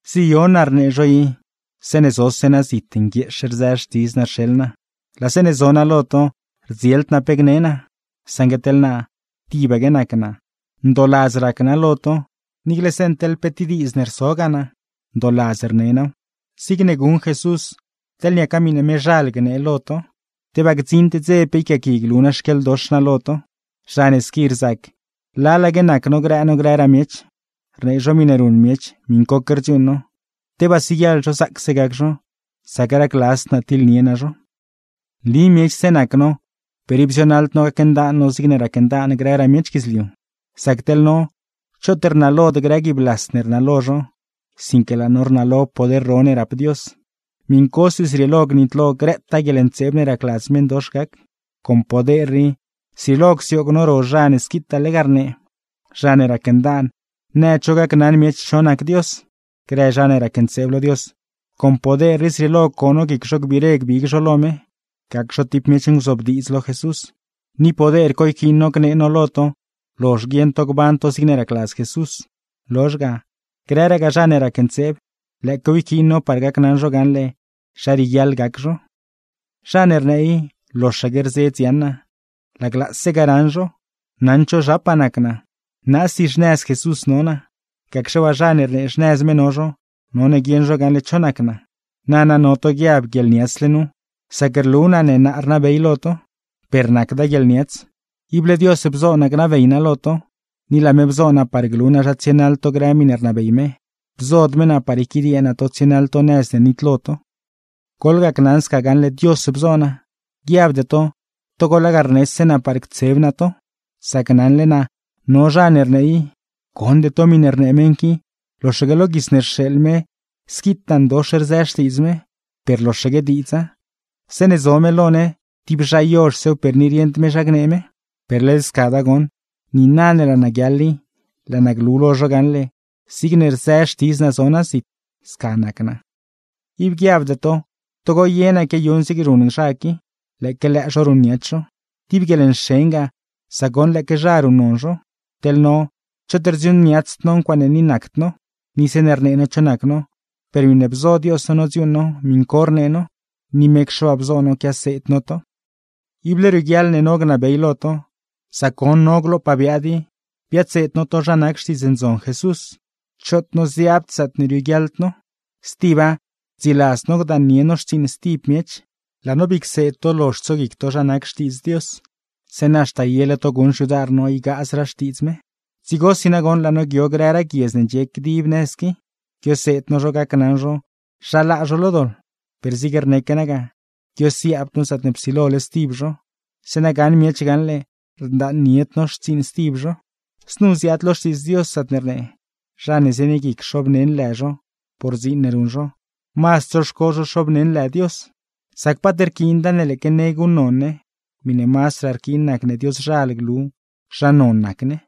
Ziyon naa rnee zho i, zeeṉe zose naa zit nguieex rzë xtidz naa rxeḻ naa; laa zeeṉe zo naa lo to, rdzield naa pe gne naa. Saṉgue teḻ naa, tibaque nac naa, ndooladz rac naa lo to, niicle zeeṉ teḻ pe diidz ne rsogaa naa, ndooladz rne naaw; zig guṉ Jesús, teḻ niaca miṉe mezhal gnee lo to. ¡Tebaa gdziṉd dze pe yquiaaqui glu naa xquieḻdox naa lo to! Zha ne squi rzac lalaque nac no grë no grëraa miech, rnee zho miṉe ruṉ miech, miṉcoque rdziuuṉ no, ¡tebaa siguieḻ zho zaacse gac zho, sac racladzd naa tiḻnie naa zho! Nli miechse nac no, per ib zionaḻd no gacndaan no zigne racndaan grëraa miech guidzliu. Sac teḻ no, choot rnalod grë guiib las ne rnalo zho, sinque laa no rnalo poder ro ne rap Dios; miṉcosi zrieelo gnitlo grëtaa guieḻntseeb ne racladz meṉdox gac. Con poder rii, zrieelo csioog no ro zha ne squitaa lega rnee, zha ne racndaan nëd zho gacnaṉ miech cho nac Dios. Grë zha ne racntseeb lo Dios, con poder rii zrieelo co no guic zho gbiire gbig zho lo me, gac zho tib miech nguzobdiidz lo Jesús. Ni poder co yquiin no gnee no lo to lozh guieṉ to gban to zigne racladz Jesús; lozh ga, grëragaa zha ne racntseeb, lëëquew yquiin no par gacnaṉ zho gaṉle zha rieguiaḻ gac zho. Zha ne rnee i loxaque rzedz yaṉ naa, laglaase ga raṉ zho, naṉd zho zhapaa nac naa. Naasi xnëz Jesús no naa; gacxe waa, zha ne rnee xnëz me no zho, none guieṉ zho gaṉle cho nac naa. Nana no to guiab guieḻniatsle nu, sac rlu naa ne naa rnabey lo to. Per nacda guieḻniats, ible Dios bzo naa gnabey naa lo to, ni laa me bzo naa par glu naa zha tsienaḻ to grë miṉe rnabey me, bzod me naa par yquidiee naa to tsienaḻ to nëz ne nitlo to. Goḻgacnaṉ sca gaṉle Dios bzo naa, guiabde to togo lega rnese naa par ctseb naa to. Sac naṉle naa no zha ne rnee i: “Gonde to miṉe rnee meṉ qui. Loxaque lo guits ne rxeeḻ me squitaa ndox rzë xtiidz me, per loxaque diidza. ¡Zeeṉe zo me lo ne, tib zha yozhsew, per ni rieṉd me zha gnee me!” Per led scada goṉ. Niina ne laa naa guiaḻ i, laa naa glu lo zho gaṉle zigne rzë xtidz naa zo naa zit, sca nac naa. Ib guiabde to, togo ye naa quiayuṉ zigne ruṉ zha qui, lëëque lëë zho ruṉniats zho. Tib guieḻnxen ga, sac goṉ lëëque zha ruṉnon zho. ¡Teḻ no, choot rdziuuṉniatsd no ncuaaṉe ni nacd no! Ni zeeṉe rnee no cho nac no, per miṉe bzo Dios no nodziuuṉ no miṉ co rnee no; ni mecxe waa bzo no quiaseed no to. Ible rioguiaḻ ne no gnabey lo to, sac goṉ no glopaa biaad i biadseed no to zha nac Xtiidz Ndzon Jesús; choot noziaabd zaatne rioguiaḻd no. Stiba, rdziladzd no gdaannie no xtsiiṉ stib miech. Laa no bii cseed to lozh tsoguic to zha nac Xtiidz Dios, zeeṉa haxta yele to guṉ xyudar no ygaazraa Xtiidz me. Dzigosi nagoṉ laa no guio grëraa guiedz ne ndxie dib nëz qui, guioseed no zho gacnaṉ zho zha laa zho lo doḻ; per zig rneque naa ga, guiosiaabd no zaatne psilole stib zho, zeeṉa gaṉ miech gaṉle rdaannied no xtsiiṉ stib zho. Znu ziaad lo Xtiidz Dios, zaatne rnee: “Zha ne zienie guic xoobneṉ lë zho por dziin ne ruṉ zho, mazd tsoxco zho xoobneṉ lë Dios.” Sac paat rquiinda ne lëëque ne guṉnon ne, miṉe mazdraa rquiin nacne Dioszhal glu zha non nac ne.